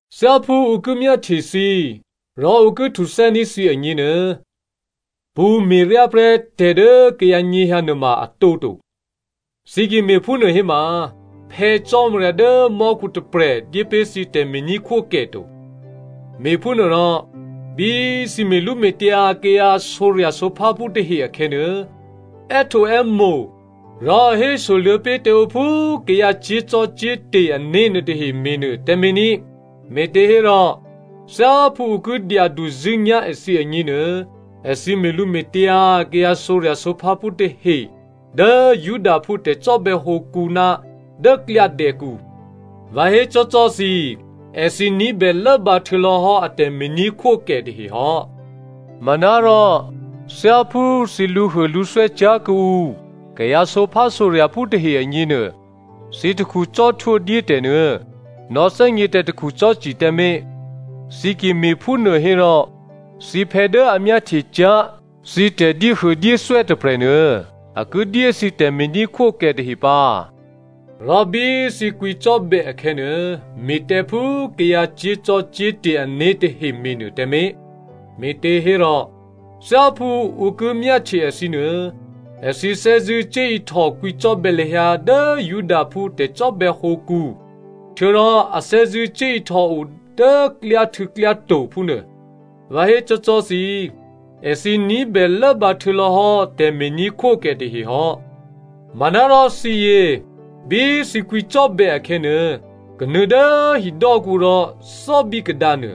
“Thyáphú ǔ ki myáhtye thǐ rò ǔ ki htuthè́ní̤ thǐ agněnuô, pṳ̌me̤ryá prè́ tè̤ dố kayǎ nyěhyǎ nuôma a tǒto. Thǐ ki me̤phúnuô héma, Phè̌ Cò́marya dố mò́khu tôprè̤ dyé pé̤ thǐ tè̤me̤ní̤khwókè to. “Me̤phúnuôrò, bí thǐ me̤lǔme̤tyǎ kayǎ sǒrya̤sǒpháphú tahe akhè̌nuô, è́htǒè́mo̤ rò hésoluô̌ pé̤ tǎ ǔ phú kayǎ cyé̤zò́cò́te̤ ané̤ nuôtahe me̤nuô tǎmé̤ ní꤮, me̤těhérò thyáphú ǔ ki dyaduzṳ̂́nyá̤ èthǐ agněnuô, èthǐ me̤lǔme̤tyǎ kayǎ sǒrya̤sǒpháphú tahe dố Judaphú tè̤cò́bè̌ hǒkǔ ná dố klyádè̌kǔ. Vǎ hécò́cò́ thǐ, èthǐ ní̤bè lốbǎ htuô̌lò̌hò́ a tè̤me̤ní̤khwókè tahehò́. Manárò, thyáphú thǐ lǔhuôlǔthwè́ cyá̤ kuô̌ǔ kayǎ sǒphásǒrya̤phú tahe agněnuô, thǐ takhu cò́htwó dyétè̤nuô nò̌thè́gně tǎ takhu cò́ci tǎmé̤. Thǐ ki me̤phúnuô hò́rò, thǐphè̌ dố a myáhtye cyá̤ thǐ tè̤dyéhuôdyéthwè́ tôprè̤nuô, a ki dyé thǐ tè̤me̤ní̤khwókè tahe pǎ.” “Rò bí thǐ kwǐcò́bè̌ akhè̌nuô, me̤ tǎ phú kayǎ cyé̤zò́cò́te̤ ané̤ tahe me̤nuô tǎmé̤, me̤těhérò, thyáphú ǔ ki myáhtye èthǐ nuô, èthǐ thè́zṳ̂́ cuốihtò kwǐcò́bè̌ lahyǎ dố Judaphú tè̤cò́bè̌ hǒkǔ htuô̌rò a thè́zṳ̂́ cuốihtòo dố klyáhtû̌klyáto̤ phúnuô. Vǎ hécò́cò́ thǐ, èthǐ ní̤bè lốbǎ htuô̌lò̌hò́ tè̤me̤ní̤khwókè tahehò́. Manárò thǐyě, bí thǐ kwǐcò́bè̌ akhè̌nuô, kanuô̌ dố hidò́kǔ rò thò́bí kadǎnuô.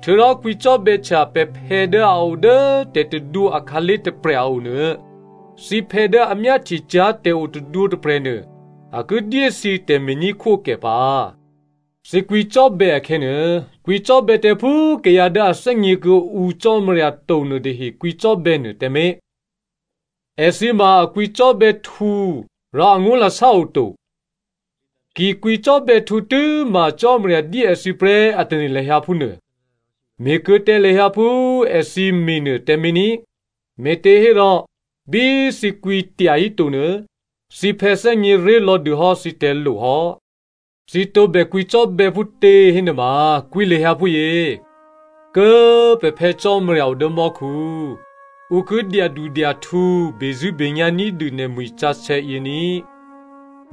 Htuô̌rò kwǐcò́bè̌htya pè̤phè̌ dố a odố tè̤tadwǒ akhǎlé̤ tôprè̤ a o nuô. Thǐphè̌ dố a myáhtye cyá̤ tè̤o tadwǒ tôprè̤nuô, a ki dyé thǐ tè̤me̤ní̤khwókè pǎ. Thǐ kwǐcò́bè̌ akhè̌nuô, kwǐcò́bè̌ tǎ phú kayǎ dố a thè́gně kuô̌ǔ Cò́marya to nuôtahe kwǐcò́bè̌ nuô tǎmé̤. Èthǐ ma a kwǐcò́bè̌htǔ rò angó̤lasá oto. Ki kwǐcò́bè̌htǔ tû́ma Cò́marya dyé èthǐ prè́ a tane̤ lahyǎ phúnuô. Me̤ kuô̌ tǎ lahyǎ phú èthǐ me̤nuô tǎmé̤ ní꤮, me̤těhérò bí thǐ kwǐ tyahíto nuô, thǐphè̌ thè́gně ré̤lò̌ dûhò́ thǐ tè̤lo hò́. “Thǐ tǒbè kwǐcò́bè̌ phútě hénuôma, kwǐ lahyǎ phúyě, ‘Kố꤮ pè̤ Phè̌ Cò́marya odố mò́khu꤮ ǔ ki dyadudyahtǔ bezṳ̂́benyá̤ ní̤dû nè̤mwi̤ sǎsè̌ yě ní꤮.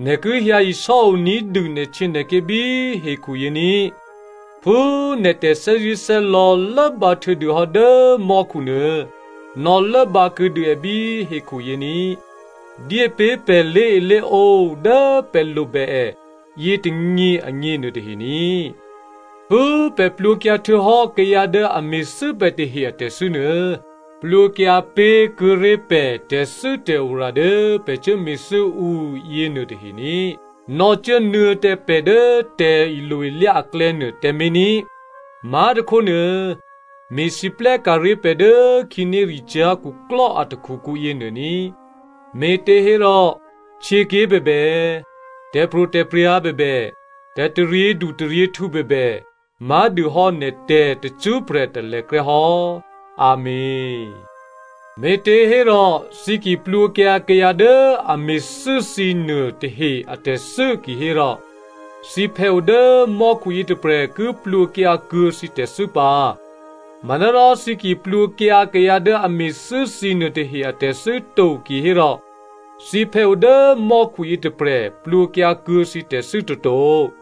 Nè̤ ki hyǎ isò́o ní̤dû nè̤htyěnè̤ké̤ bí hekhu yě ní꤮. Phú nè̤ tè̤thè́zṳ̂́thè́lò̌ lốbǎ htuô̌dûhò́ dố mò́khunuô, nò̌lốbǎ kuô̌dû è bí hekhuyě ní꤮. Dyépé̤ pè̤ lé̤elé̤ǒ dố pè̤ lobè è yětônyě agně nuôtahe ní꤮. Phú pè̤ plwǒkyǎ htuô̌hò́ kayǎ dố a me̤thû́ pè̤ tahe atè̤thû́ nuô, plwǒkyǎ pé̤kuô̌ ré̤ pè̤ tè̤thû́tè̤ora dố pè̤ cuốme̤thû́ ǔ yěnuôtahe ní꤮. Nò̌cuốnuô̌ tǎ pè̤ dố tè̤ilo-ilyá aklè̌nuô tǎmé̤ ní꤮. Má̤tôkhónuô me̤lwóhteka̤ ré̤ pè̤ dố khǐnéricyá̤ khuklò́ a takhukǔ yěnuô ní꤮. (Me̤těhérò htyěké̤ bèbè, tè̤pro̤tè̤prya̤ bèbè, tè̤taryědu taryěhtǔ bèbè má̤dûhò́ nè̤tè̤ tacṳ́prè̤ talèkrè́ hò́. Amèn.)’ “Me̤těhérò thǐ ki plwǒkyǎ kayǎ dố a me̤thû́ thǐnuô tahe atè̤thû́ kihérò, thǐphè̌ o dố mò́khu yětôprè̤ ki plwǒkyǎkuô̌ thǐ tè̤thû́ pǎ. Manárò thǐ ki plwǒkyǎ kayǎ dố a me̤thû́ thǐ nuôtahe atè̤thû́ to kihérò, thǐphè̌ o dố mò́khu yětôprè̤ plwǒkyǎkuô̌ thǐ tè̤thû́ toto.”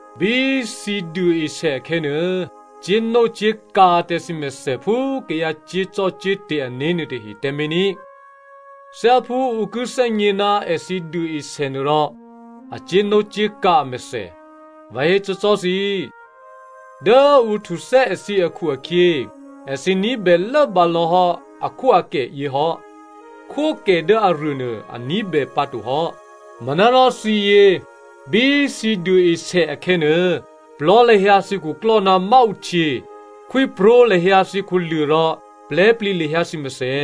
“Bí thǐ duôesè akhè̌nuô, cyé̤nócyé̤kǎ tǎ thǐmèthè phú kayǎ cyé̤zò́cò́te̤ ané̤ nuôtahe tǎmé̤ ní꤮. Thyáphú ǔ ki thè́gně ná èthǐ duôesè nuôrò a cyé̤nócyé̤kǎ amèthè. Vǎ hécò́cò́ thǐ, dố ǔ htuthè́ èthǐ akhu-akhyě, èthǐ ní̤bè lốbǎ lò̌hò́ akhwóakèyě hò́. Khwókè dố aruô nuô a ní̤bè pǎtohò́. Manárò thǐyě, bí thǐ duôesè akhè̌nuô, plò̤́ lahyǎ thǐ khuklò́ ná máǔhtyě, khwípró̤ lahyǎ thǐ khuluô̤ rò plè̤́plǐ lahyǎ thǐ mèthè.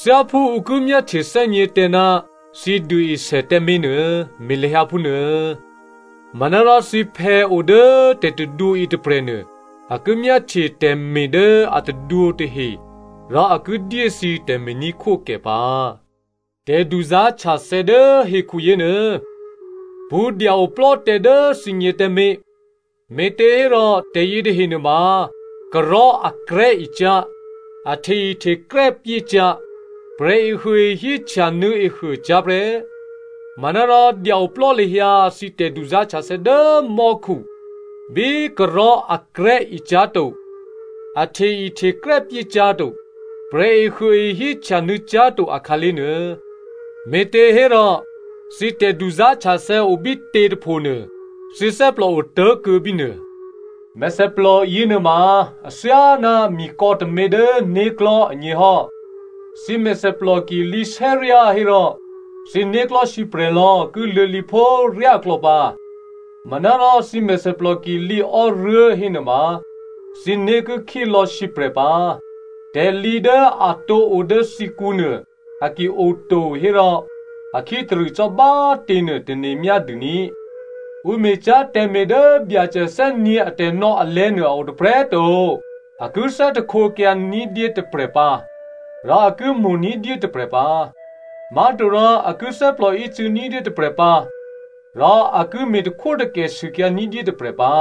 Thyáphú ǔ ki myáhtyethè́gně tǎ ná thǐ duôesè tǎmé̤ nuô, me̤ lahyǎ phúnuô. Manárò thǐphè̌ odố tè̤tadwǒ yětôprè̤nuô a ki myáhtye tè̤me̤ dố a tadwǒ tahe rò a ki dyé thǐ tè̤me̤ní̤khwókè pǎ.” “Tè̤duzá̤htyathè̌ dố hekhu yěnuô, pṳ̌ dya-oplò́ tǎ dố thǐgně tǎmé̤, me̤těhérò tè̤ yětahe nuôma karò̤́ akrè̤́ e cyá̤, a hte-ihtekrè́ pyécyá̤, prè̤ehuôehí htyanuô̌ ehuô cyá̤ prè́. Manárò dya-oplò́ lahyǎ thǐ tè̤duzá̤htyathè̌ dố mò́khu bí karò̤́ akrè̤́ e cyá̤ to, a hte-ihtekrè́ pyécyá̤to, prè̤ehuôehí htyanuô̌ cyá̤to akhǎlé̤ nuô. Me̤těhérò, thǐ tè̤duzá̤htyathè̌ obítě tôphonuô, thǐ thè́plò otố̤kuô̌ bínuô.” “Mèthèplò yěnuôma athyáná mikò̌ tômě dố né̤klò̤́ agněhò́, thǐ mèthèplò ki lǐsè́ryá hérò, thǐ né̤klò̤́ sǐprè̤lò̌ ki luô̌lǐphó ryáklò̌ pǎ. Manárò thǐ mèthèplò ki lǐò́ruố̤ hénuôma, thǐné̤ ki khílò̌ sǐprè̤ pǎ. Tè̤lǐ dố a tǒ odố thǐkǔnuô, a ki oto hérò, a khítarṳ̂ cò́ bá꤮ těnuô tane̤ myádû ní꤮.” “Ǔ me̤cyá̤ tè̤me̤ dố Byacè thè́nyě̤ atè̤nò̌ alè̤̌nuô a o tôprè̤꤮ to. A ki thè́htekyǎ ní̤dyé tôprè̤ pǎ, rò a ki mo̤ ní̤dyé tôprè̤ pǎ. Má̤torò a ki thè́plòícû̌ ní̤dyé tôprè̤ pǎ, rò a ki me̤takhwótakè sûkyǎ ní̤dyé tôprè̤ pǎ.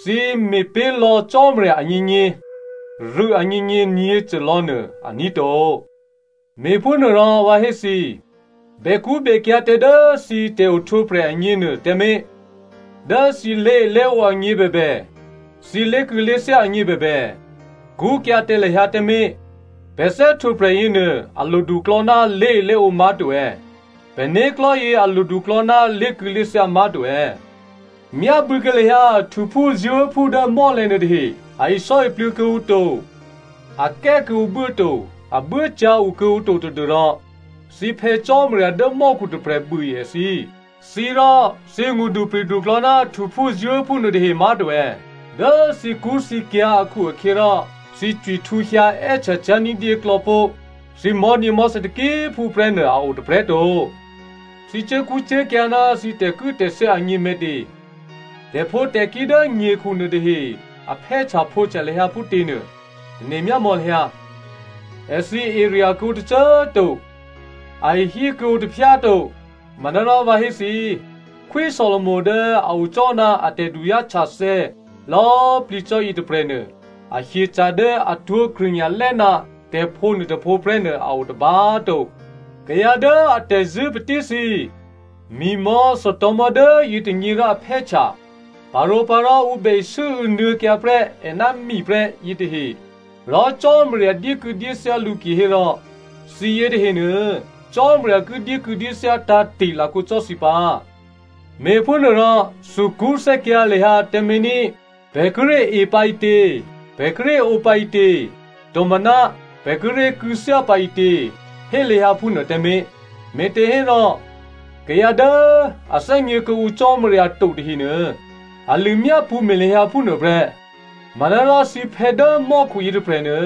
Thǐ me̤pé̤lò̌ Cò́marya agněgně, rû̌ agněgně nyě̤côlò̌ nuô, aní̤ to.” “Me̤phúnuôrò vǎ hé thǐ, bèkṳ́bèkyǎ̤ tǎ dố thǐ tè̤ohtwǒprè̤ agněnuô tǎmé̤. Dố thǐ lé̤elé̤ǒ agně bèbè, thǐ lé̤kû̌lé̤thyá agně bèbè, kṳ́kyǎ̤ tǎ lahyǎ tǎmé̤. Pè̤ thè́htwǒprè̤ yěnuô a loduklò̌ ná lé̤elé̤ǒ má̤to è̌? Pè̤ né̤klò̤́yě a loduklò̌ ná lé̤kû̌lé̤thyá má̤to è̌? Myábû̌kuô̌ lahyǎ htuphúzuố̤phú dố mò́lè̤̌ nuôtahe. A isò́iplû̌ kuô̌ǔ to, a kè́ kuô̌ǔ buố to, a buốcyǎ okuô̌ǔ to tadû́rò thǐ Phè̌ Cò́marya dố mò́khu tôprè̤ buôe èthǐ. Thǐ rò, thǐ ngṳdupri̤duklò̌ ná htuphúzuố̤phú nuôtahe má̤to è̌? Dố thǐkṳ́thǐkyǎ̤ akhu-akhyěrò, thǐ cwihtǔhyǎ è́htya cyá̤ ní̤dyéklò̌ pó̤ thǐ mò̤́nyěmò̤́thè̌ taki꤮ phú prè́nuô a o tôprè̤꤮ to. “Thǐ cuốkṳ́cuốkyǎ̤ ná thǐ tè̤kû̌tè̤thyá agně me̤tě? Tè̤phǒtè̤kí̤ dố nyekhu nuôtahe a phè́htyaphǒhtya lahyǎ phútěnuô, tane̤ myámò̌ lahyǎ. Èthǐ erya̤ kuô̌ǔ tôcô꤮ to, a ihí kuô̌ǔ taphyá to. Manárò vǎ hé thǐ꤮, Khwí Solomo dố a o cò́ ná a tè̤duzá̤htyathè̌ lò̌꤮ plǐ cò́ yětôprè̤nuô, a hyeca̤ dố atwó̤ krṳ̂nya̤lè́ ná tè̤phǒ nuôtôphǒ prè́nuô a o tôba꤮ to. Kayǎ dố a tè̤zṳ̂́ patíthǐ꤮ mi̤mò̤́ thòtò̤̌mò̤́ dố yětônyě rò aphè́htya, parǒpǎ rò ǔ bè isû́û̌ nuô̌kyǎ prè́ è ná mi prè́ yětahe꤮ rò Cò́marya dyékû̌dyéthyá lǔ kihérò, thǐyě tahenuô, Cò́marya ki dyékû̌dyéthyá tǎ̤te̤ lakǒ cò́ thǐ pǎ. Me̤phúnuôrò, thukṳ́thè́kyǎ̤ lahyǎ tǎmé̤ ní꤮. ‘Pè̤ kíré̤ e pǎ ǐtě?’ ‘Pè̤ kíré̤ ǒ pǎ ǐtě?’ Tomaná ‘Pè̤ kíré̤ kû̌thyá pǎ ǐtě?’ Hé lahyǎ phúnuô tǎmé̤. Me̤těhérò kayǎ dố a thè́gně kuô̌ǔ Cò́marya to tahenuô, a lṳ̂myápṳ̌ me̤ lahyǎ phúnuô prè́. Manárò thǐphè̌ dố mò́khu yětôprè̤nuô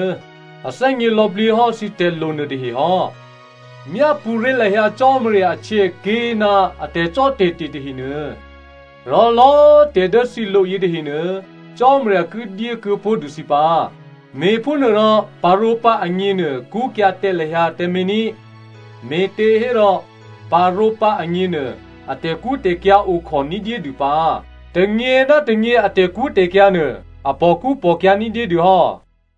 a thè́gně lò̌plǐ hò́ thǐ tè̤lo nuôtahe hò́. Myápṳ̌ ré̤ lahyǎ Cò́marya ahtyěaké̤ ná a tè̤cò́tè̤te̤ tahenuô, rò lò̌꤮ tè̤dố thǐ lo yětahenuô, Cò́marya ki dyé kuô̌pó̤dû thǐ pǎ. Me̤phúnuôrò, parǒpǎ agněnuô kṳ́kyǎ̤ tǎ lahyǎ tǎmé̤ ní꤮, me̤těhérò, parǒpǎ agněnuô, a tè̤kṳ́tè̤kyǎ̤ okhò ní̤dyédû pǎ. Tônyě ná tônyě a tè̤kṳ́tè̤kyǎ̤ nuô a pòkṳ́pòkyǎ̤ ní̤dyédû hò́.”